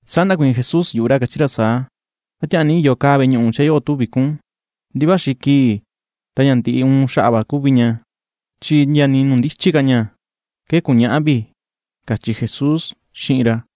Saa ndakuiin Jesús yuꞌu ra, kachi ra saa: ―¿A tiaa ni iyo kaa veꞌe ñuꞌu chee yoꞌo tuvi kun? Ndi vaxi kii ra ña ndiꞌi uun xaꞌa va kuvi ña. Chi ndia nii nuu ndichi ka ña ke ku̱ñäꞌa vi ―kachi Jesús xiꞌin ra.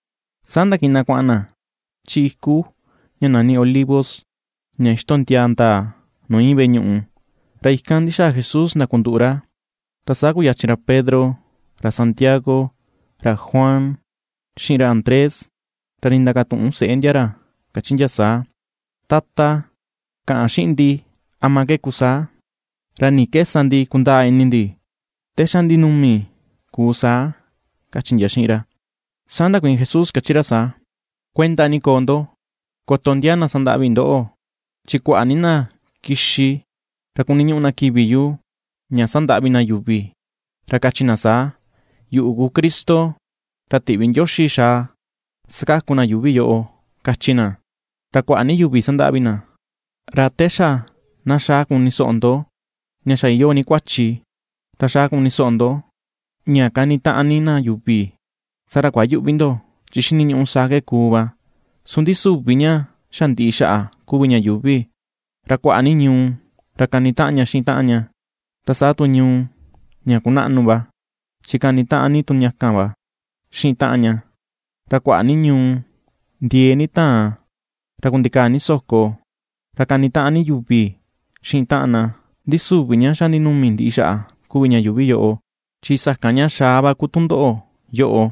Saa ndakiꞌin na kuaꞌan na chi iku ña nani Olivo, ña ixtondiaa ndaa nuu iin veꞌe ñuꞌu. Ra ikan ndi̱xàà Jesús ndakunduꞌu ra, ra saa kuyachin ra Pedro, ra Santiago, ra Juan, xiꞌin ra Andrés, ra ndindakatuꞌun seꞌe ndia ra kachi ndia saa: ―Tata, kaꞌan xiꞌin ndi, ¿ama ke kuu saa? ¿Ra ni ke sa ndi kundaa ini ndi te xa ndinumi ku saa? ―kachi ndia xiꞌin ra. Saa ndakuiin Jesús kachi ra saa: ―Kuenta ni koo ndo koto ndiaa na sandaꞌvi ndoꞌo. Chi kuaꞌa ni na kixi ra kuniñuꞌu na kivi yu ña sandaꞌvi na yuvi, ra kachi na saa: “Yuꞌu ku Cristo ra tiꞌvi Ndioxi xaa sakaku na yuuvi yoꞌo”, kachi na, ra kuaꞌa ni yuvi sandaꞌvi na. Ra te xa na xaꞌa kunisoꞌo ndo ña xa iyoo ni kuachi ra xaꞌa kunisoꞌo ndo ña kanitaꞌan ni na yuvi, saa ra kuayüꞌvi ndo, chi xiniñuꞌu saa ke kuu va. Su ndi süvi ña xa ndiꞌi xaꞌa kuvi ña yuuvi. Ra kuaꞌa ni ñuu ra kanitaꞌan ña xiꞌin taꞌan ña, ra saa tu ñuu ña kunaꞌnu va, chi kanitaꞌan ni tu ña kan va xiꞌin taꞌan ña; ra kuaꞌa ni ñuu ndiee ni taan, ra kundikaa ni so̱kò, ra kanitaꞌan ni yuvi xiꞌin taꞌan na; ndi süvi ña xa ndinumi ndiꞌi xaꞌa kuvi ña yuuvi yoꞌo, chi sakan ña xaꞌa va ku tundoꞌo yoꞌo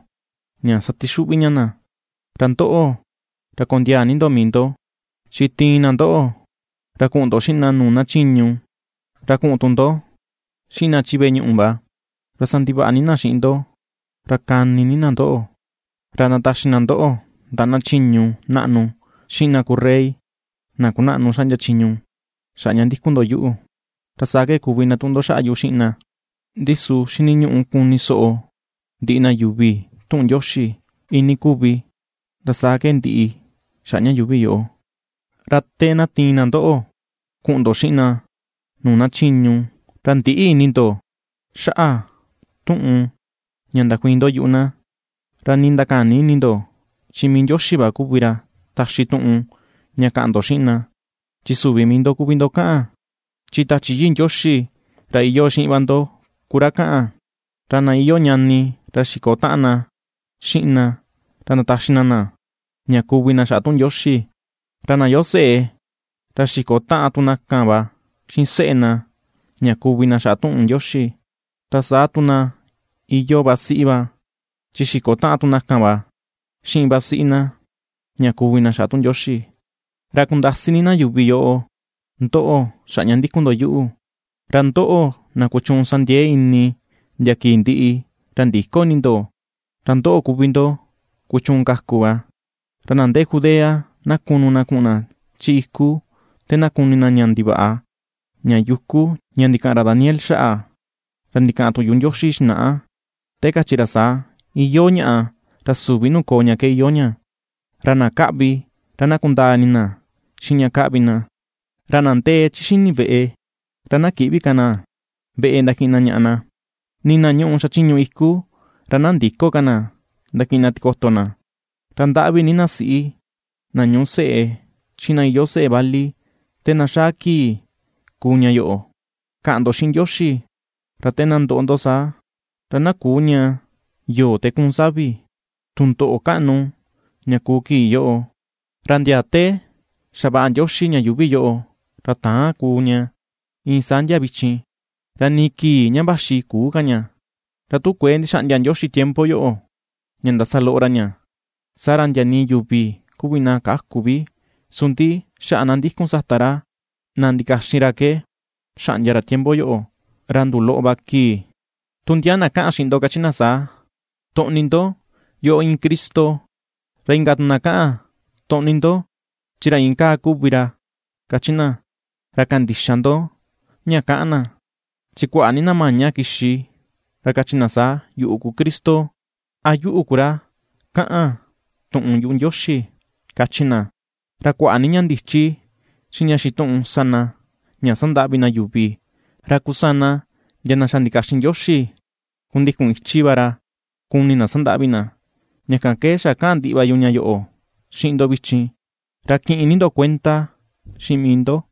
ña satixuꞌvi ña na. ’Ra ndoꞌo, ra kondiaa ni ndo mii ndo; chi tiin na ndoꞌo ra kuꞌun ndo xiꞌin na nuu na chiñu, ra kuꞌun tu ndo xiꞌin na chi veꞌe ñuꞌu va, ra sandivaꞌa ni na xiꞌin ndo ra kani ni na ndoꞌo. Ra ndataxi na ndoꞌo ndaꞌa na chiñu naꞌnu xiꞌin na ku rey, na kunaꞌnu xaꞌndia chiñu xaꞌa ña ndikun ndo yuꞌu; ra saa ke kuvi ndatuꞌun ndo xaꞌa yu xiꞌin na. Ndi su xiniñuꞌu kunisoꞌo ndiꞌi na yuvi tuꞌun Ndioxi iin ni kuvi, ra saa ke ndiꞌi xaꞌa ña yuuvi yoꞌo. Ra te na tiin na ndoꞌo kuꞌun ndo xiꞌin na nuu na chiñu, ra ndïꞌi ini ndo xaꞌa tuꞌun ña ndakuiin ndo yuꞌu na, ra nii ndakäni ini ndo; chi mii Ndioxi va kuvi ra taxi tuꞌun ña kaꞌan ndo xiꞌin na, chi süvi mii ndo kuvi ndo kaꞌan, chi Tachi Yii Ndioxi ra iyoo xiꞌin va ndo ku ra kaꞌan. Ra na iyoo ñani, ra xi̱ko̱ taꞌan na xiꞌin na ra ndataxi na na, ña kuvi na xaꞌa tuꞌun Ndioxi, ra na iyoo seꞌe ra xi̱ko̱ taꞌan tu na kan va xiꞌin seꞌe na ña kuvi na xaꞌa tuꞌun Ndioxi, ra saa tu na iyoo vasiꞌi va chi xiko taꞌan tu na kan va xiꞌin vasiꞌi na ña kuvi na xaꞌa tuꞌun Ndioxi. Ra kundasi ni na yuvi yoꞌo ndóꞌo̱ xaꞌa ña ^ndíku̱n ndo yuꞌu, ra ndoꞌo, na kuchuun sandiee ini ndia kii ndiꞌi, ra ndïko ini ndo, ra ndóꞌo̱ kuvi ndo kuchuun kaku va. ’Ra na ndee Judea na kunu na kuꞌun na chi iku te na kuni na ña ndivaꞌa, ña yuku, ña ndikaꞌan ra Daniel xaꞌa, ra ndikaꞌan tuꞌun yuꞌu Ndioxi xinaꞌa, te kachi ra saa, “Iyoo ñaꞌa ra süvi nuu koo ña ke iyoo ña.” (Ra na kaꞌvi, ra na kundaa ini na xiꞌin ña kaꞌvi na). Ra na ndee chi xi̱ni̱ veꞌe, ra na kïꞌvi ka na veꞌe ndakiꞌin na ñaꞌa na; Nii na ñuꞌu xachiñu iku, ra na ndïko ka na ndakiꞌin na tikoto na. Ra ndaꞌvi ni na siꞌi na ñuꞌu seꞌe, xiꞌin na iyoo seꞌe vali te na xaa kii kuu ña yoꞌo. Kaꞌan ndo xiꞌin Ndioxi ra te na ndoꞌo ndo saa, ra na küu ña yo̱o̱ te kuun savi. Tundoꞌo kaꞌnu ña kuu kii yoꞌo, ra ndia te xavaꞌa Ndioxi ña yuuvi yoꞌo ra täan kuu ña, iin saa ndia vichin, ra nii kii ña vaxi küu ka ña. Ra tu kuëe ndixaꞌndia Ndioxi tiempo yoꞌo ña ndasa loꞌo ra ña, saa ra ndia nii yuvi kuvi na käku vi, su ndi xaꞌa na ^ndíku̱n sata ra, na ndikaxin ra ke xaꞌndia ra tiempo yoꞌo ra nduloꞌo va kii. ’Tu ndia na kaꞌan xiꞌin ndo, kachi na saa: “¡Toꞌni ndo, yoꞌo iin Cristo!” Ra inka tu na kaꞌan: “¡Toꞌni ndo chi ra iin kaa kuvi ra!” kachi na, ra kandïxa ndo ña kaꞌan na. Chi kuaꞌa ni na maña kixi ra kachi na saa, “Yuꞌu ku Cristo”, a “Yuꞌu ku ra kaꞌan tuꞌun yuꞌu Ndioxi”, kachi na. Ra kuaꞌa ni ña ndichi xiꞌin ña xituꞌun sa na ña sandaꞌvi na yuvi, ra kusana ndia na xa ndikaxin Ndioxi kundikun ichi va ra ku̱ni̱ na sandaꞌvi na. Ña kan ke xa kaꞌan ndiꞌi va yu ña yoꞌo xiꞌin ndo vichin, ra kiꞌin ni ndo kuenda xiꞌin mii ndo.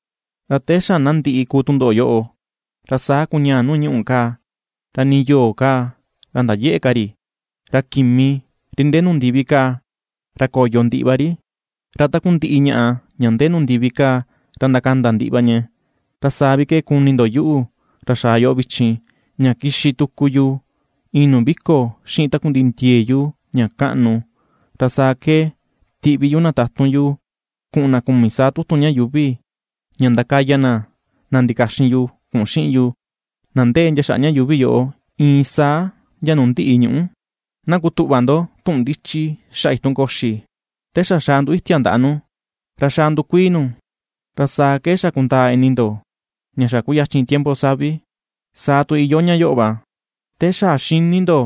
’Ra te xa na ndiꞌi kuu tundoꞌo yoꞌo, ra saa kuñaà nuu ñuꞌù kaa, ra nii yo̱o̱ kaa ra ndayëꞌe̱ ka ri. Ra kimi, ri ndee nuu ndivi kaa, ra ko̱yo ndiꞌi va ri, ra takundiꞌi ñaꞌa ña ndee nuu ndivi kaa ra ndakanda ndiꞌi va ña. Ra saa vi ke kuni ndo yuꞌu, ra xaa yoꞌo vichin, ña kixi tuku yu iin nuu vi̱ko̱ xiꞌin takundiꞌi ndie̱e̱ yu ña kaꞌnu. Ra saa ke tiꞌvi yu na tatun yu kuꞌun na kumi saa tutun ña yuuvi, ña ndakaya na na ndikaxin yu kuꞌun xiꞌin yu, na ndee ndia xaꞌa ña yuuvi yoꞌo, iin saa ndia nuu ndiꞌi ñuꞌú. ’Na kutuꞌva ndo tuꞌun ndichi xaꞌa itun koxi: Te xa xaꞌa ndu̱itia ndaꞌa nu, ra xa ndukuii nu, ra saa ke xa kundaa ini ndo ña xa kuyachin tiempo savi. Saa tu iyoo ña yoꞌo va, te xa xini ndo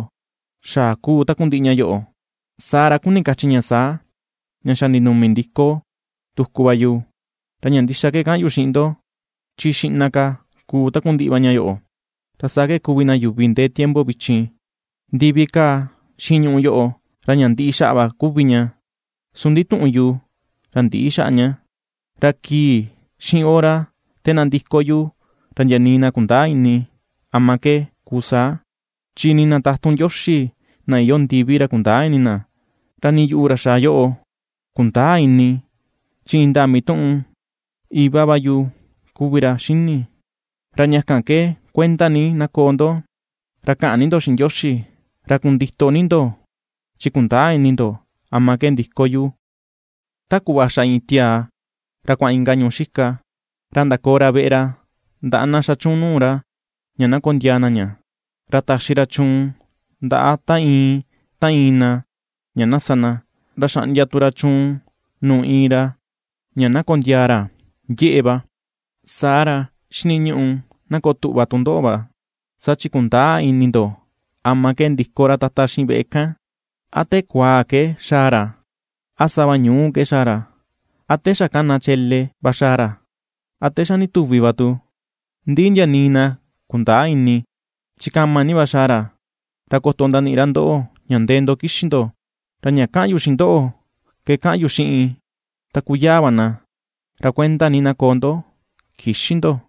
xaꞌa kuu takundiꞌi va ña yoꞌo, saa ra kuni kachi ña saa, ña xa ndinumi ni ndiko tuku va yu. Ra ña ndixa ke kaꞌan yu xiꞌin ndo, chi xiꞌna ka kuu takundiꞌi ña yoꞌo, ra saa ke kuvi na yuvi ndee tiempo vichin. Ndivi kaa xiꞌin ñuꞌu yoꞌo, ra ña ndiꞌi xaꞌa va kuvi ña, su ndi tuꞌun yu ra ndïꞌi xaꞌa ña. ’Ra kii xiꞌin hora te na ndiko yu, ra ndia nii na kundäa ini ama ke kuu saa, chi nii na tatun Ndioxi na iyoo ndivi ra kundäa ini na; ra ni yuꞌu, ra xaa yoꞌo, kundäa ini; chi indaa mituꞌun Iva va yu kuvi ra xini. ’Ra ña kan ke kuenda ni na koo ndo, ra kaꞌan ni ndo xiꞌin Ndioxi, ra kundito ni ndo chi kundäa ini ndo ama ke ndiko yu. Ta kuꞌva xa iin tiaa ra kuaꞌan inka ñuu xika, ra ndakoo ra veꞌe ra ndaꞌa na xa chuun nuu ra ña na kondiaa na ña, ra taxi ra chuun ndaꞌa ta iin, ta iin na, ña na sa na, ra xaꞌndia tu ra chuun nuu iin ra ña na kondiaa ra yeꞌe va. Saa ra, xiniñuꞌu na koo tuꞌva tu ndoꞌo va, saa chi kundäa ini ndo ama ke ndiko ra Tata xiꞌin veꞌe kan; a te kuaa ke xaa ra, a sava ñu̱u ke xaa ra, a te xa kana chele va xaa ra, a te xa ndituvi va tu, ndi ndia nii na kundaa ini. Chi kama ni va xaa ra, ra koto ndaniꞌi ra ndoꞌo ña ndee ndo kixi̱ ndo. Ra ña kaꞌan yu xiꞌin ndoꞌo ke kaꞌan tu yu xiꞌin taku yaa va na: ra kuenda ni na koo ndo; kïxi ndo.